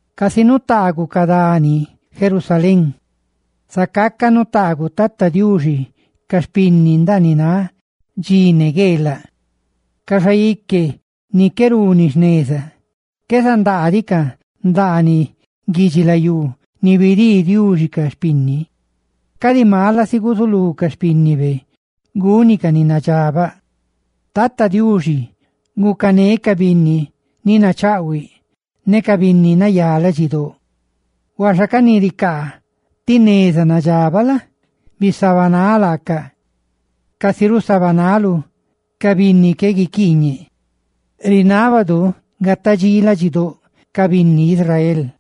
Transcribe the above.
Casica nutaaguꞌ ca dani Jerusalén, zacaca nutaaguꞌ Tata Diuxi ca xpinni ndaaniꞌ náꞌ dxi ne gueelaꞌ. Ca xaique ni qué runi jneza qué zandaadicaꞌ ndaaniꞌ guidxilayú ni bidii Diuxi ca xpinni, cadi mala si guzulú ca xpínnibe gúnicaꞌ ni nadxabaꞌ. Tata Diuxi, gucané ca binni ni nachaꞌhuiꞌ, ne ca binni nayá ladxidóꞌ; huaxa ca ni ricaa ti neza nadxabaꞌ la? bisabanáꞌ laacaꞌ casi rusabanaluꞌ ca binni qué guiquiiñe. ¡Gataꞌ dxí ladxidóꞌ Israel!